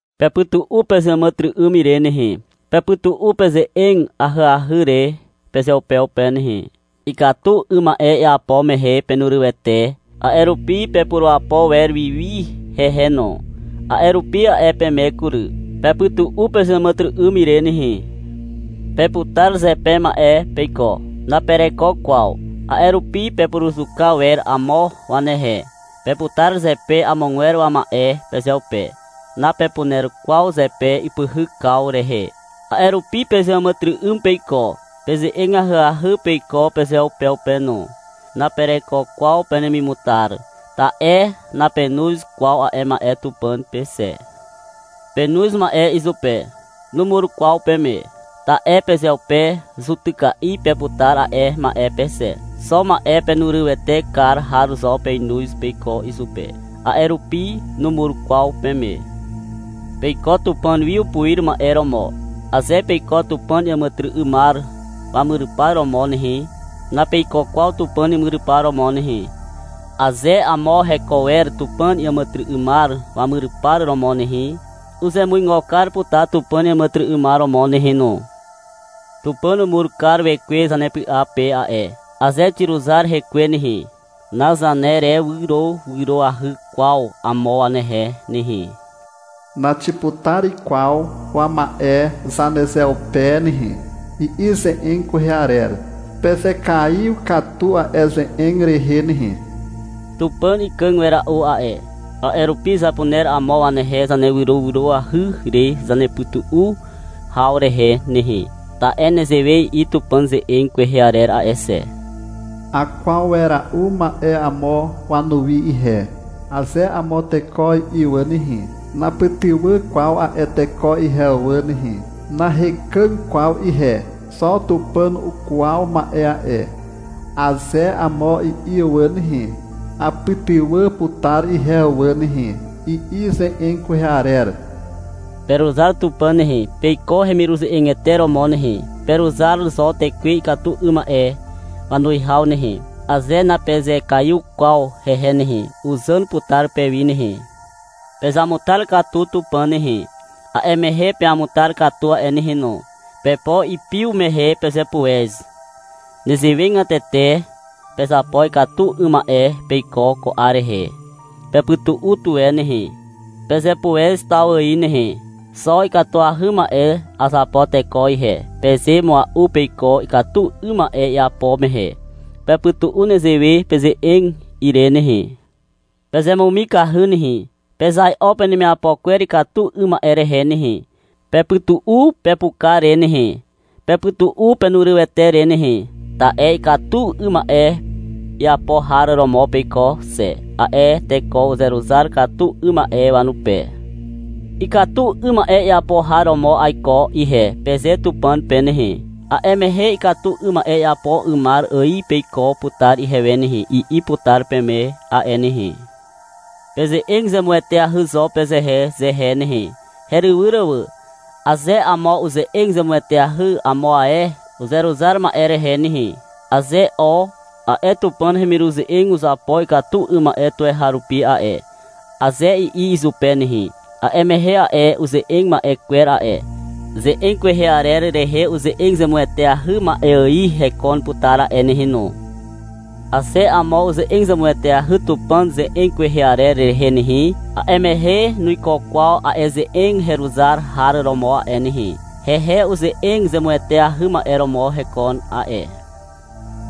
Pepytu'u pezeàmàtyry'ym ire nehe. Pepytu'u peze'eg ahyahy re pezeupeupe nehe. Ikatu 'ym ma'e iapo mehe penurywete, a'e rupi pepurapo wer wiwi hehe no. A'e rupi a'e peme kury. — Pepytu'u pezeàmàtyry'ym ire nehe. Peputar zepe ma'e peiko. Napereko kwaw. A'e rupi pepuruzuka wer amo wanehe. Peputar zepe amogwer wama'e pezeupe. Napepuner kwaw zepe ipyhykaw rehe. A'e rupi pezeàmàtyry'ym peiko. Peze'eg ahyahy peiko pezeupeupe no. Napereko kwaw penemimutar, ta'e napenoz kwaw a'e ma'e Tupàn pe xe. Penoz ma'e izupe. Numur kwaw peme. Ta'e pezeupe zutyka'i peputar a'e ma'e pe xe. Xo ma'e pemurywete kar har zo penoz peiko izupe. A'e rupi numur kwaw peme. Peiko Tupàn wi upuir ma'e romo. Aze peiko Tupàn iàmàtyry'ymar wamyrypar romo nehe, napeiko kwaw Tupàn imyrypar romo nehe. Aze amo heko wer Tupàn iàmàtyry'ymar wamyrypar romo nehe, uzemuigo kar putar Tupàn iàmàtyry'ymar romo nehe no. — Tupàn umur kar Wekwe zanepy'a pe a'e. Aze xiruzar Hekwe nehe, nazanerewyrowyroahy kwaw amo wanehe nehe. Naxiputar kwaw wama'e zanezeupe nehe, i'i ze'eg kwehe arer. Pezekaiw katu a'e ze'eg rehe nehe. Tupàn ikàg wera'u a'e. A'e rupi zapuner amo wanehe zanerewyrowyroahy re zanepytu'u haw rehe nehe. Ta'e nezewe i'i Tupàn ze'eg kwehe arer a'e xe. — Akwaw wera'u ma'e amo wanuwi ihe, aze amo teko i'i wà nehe, napytywà kwaw a'e teko ihe wà nehe. — Nahekàg kwaw ihe, xo Tupàn ukwaw ma'e a'e, aze amo i'i wà nehe, apytywà putar ihe wà nehe, i'i ze'eg kwehe arer. Peruzar Tupàn nehe, peiko hemiruze'egete romo nehe. Peruzar zo tekwe ikatu 'ym ma'e wanuwihaw nehe. Aze napezekaiw kwaw hehe nehe, uzàn putar pewi nehe. Pezamutar katu Tupàn nehe. A'e mehe peamutar katu a'e nehe no. Pepo ipiw mehe pezepuez. Nezewegatete, pezapo ikatu 'ym ma'e peiko ko 'ar rehe. Pepytu'u tuwe nehe, pezepuez taw ài nehe. — Xo ikatuahy ma'e azapo teko ihe, peze mua'u peiko, ikatu 'ym ma'e iapo mehe. Pepytu'u nezewe peze'eg ire nehe. Pezemumikahy nehe. Pezai'o penemiapo kwer ikatu 'ym ma'e rehe nehe. Pepytu'u pepuka re nehe, pepytu'u penurywete re nehe, ta'e ikatu 'ym ma'e iapo har romo peiko xe, a'e teko uzeruzar katu 'ym ma'e wanupe. — Ikatu 'ym ma'e iapo har romo aiko ihe, peze Tupàn pe nehe. A'e mehe — Ikatu 'ym ma'e iapo 'ymar ài peiko putar ihewe nehe, i'i putar peme a'e nehe. Peze'eg zemueteahy zo pezehezehe nehe, herywyr wà. Aze amo uze'eg zemueteahy amo ae uzeruzar ma'e rehe nehe, aze — O, a'e Tupàn hemiruze'eg uzapo ikatu 'ym ma'e tuweharupi a'e, aze i'i izupe nehe, a'e mehe a'e uze'eg ma'e kwer a'e, ze'eg kwehe arer rehe uze'eg zemueteahy ma'e ài hekon putar a'e nehe no. Aze amo uze'eg zemueteahy Tupàn ze'eg kwehe arer rehe nehe, a'e mehe nuiko kwaw a'e ze'eg heruzar har romo a'e nehe. Hehe uze'eg zemueteahy ma'e romo hekon a'e.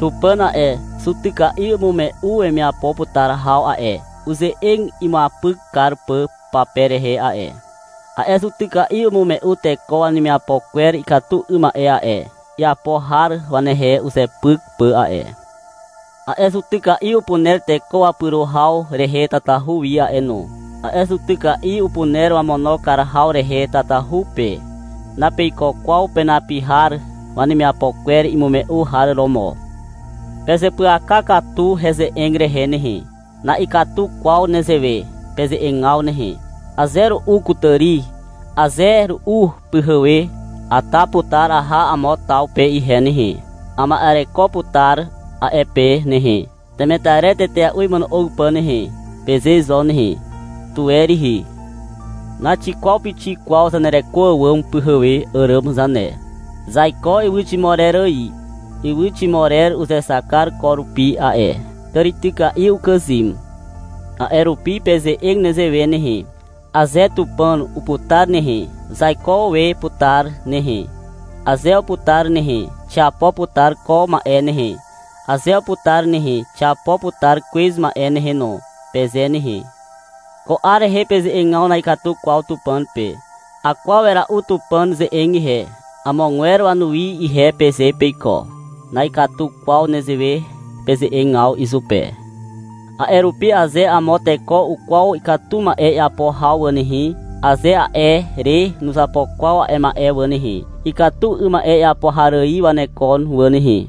Tupàn a'e zutyka'i umume'u wemiapo putar haw a'e, uze'eg imuapyk kar pà pape rehe a'e. A'e zutyka'i umume'u teko wanemiapo kwer ikatu 'ym ma'e a'e, iapo har wanehe uzepyk pà a'e. A'e zutyka'i upuner teko wapyro haw rehe tatahu wi a'e no. A'e zutyka'i upuner wamono kar haw rehe tatahu pe. Napeiko kwaw penapi har wanemiapo kwer imume'u har romo. Pezeapyaka katu heze'eg rehe nehe. Na'ikatu kwaw nezewe peze'egaw nehe. — Aze ru'u kutàri, aze ru'u pyhewe, ata putar aha amo taw pe ihe nehe. Ama'ereko putar a'e pe nehe, temetarer tetea'u imono'og pà nehe, peze zo nehe. Tuwe rihi. Naxikwaw pixik kwaw zanereko àwàm pyhewe àràm zane. Zaiko ywyximorer ài. Ywyximorer uzexak kar e ko rupi a'e. Tàrityka'i ukàzym. A'e rupi, peze'eg nezewe nehe. — Aze Tupàn uputar nehe, zaiko we putar nehe. Aze uputar nehe, xiapo putar ko ma'e nehe. Aze uputar nehe, xiapo putar kwez ma'e nehe no, peze nehe. Ko 'ar rehe peze'egaw na'ikatu kwaw Tupàn pe. — Akwaw wera'u Tupàn ze'eg ihe, amogwer wanuwi ihe, peze peiko. Na'ikatu kwaw nezewe peze'egaw izupe. A'e rupi aze amo teko ukwaw ikatu ma'e iapo haw wà nehe, aze a'e re nuzapo kwaw a'e ma'e wà nehe, ikatu 'ym ma'e iapo har ài wanekon wà nehe.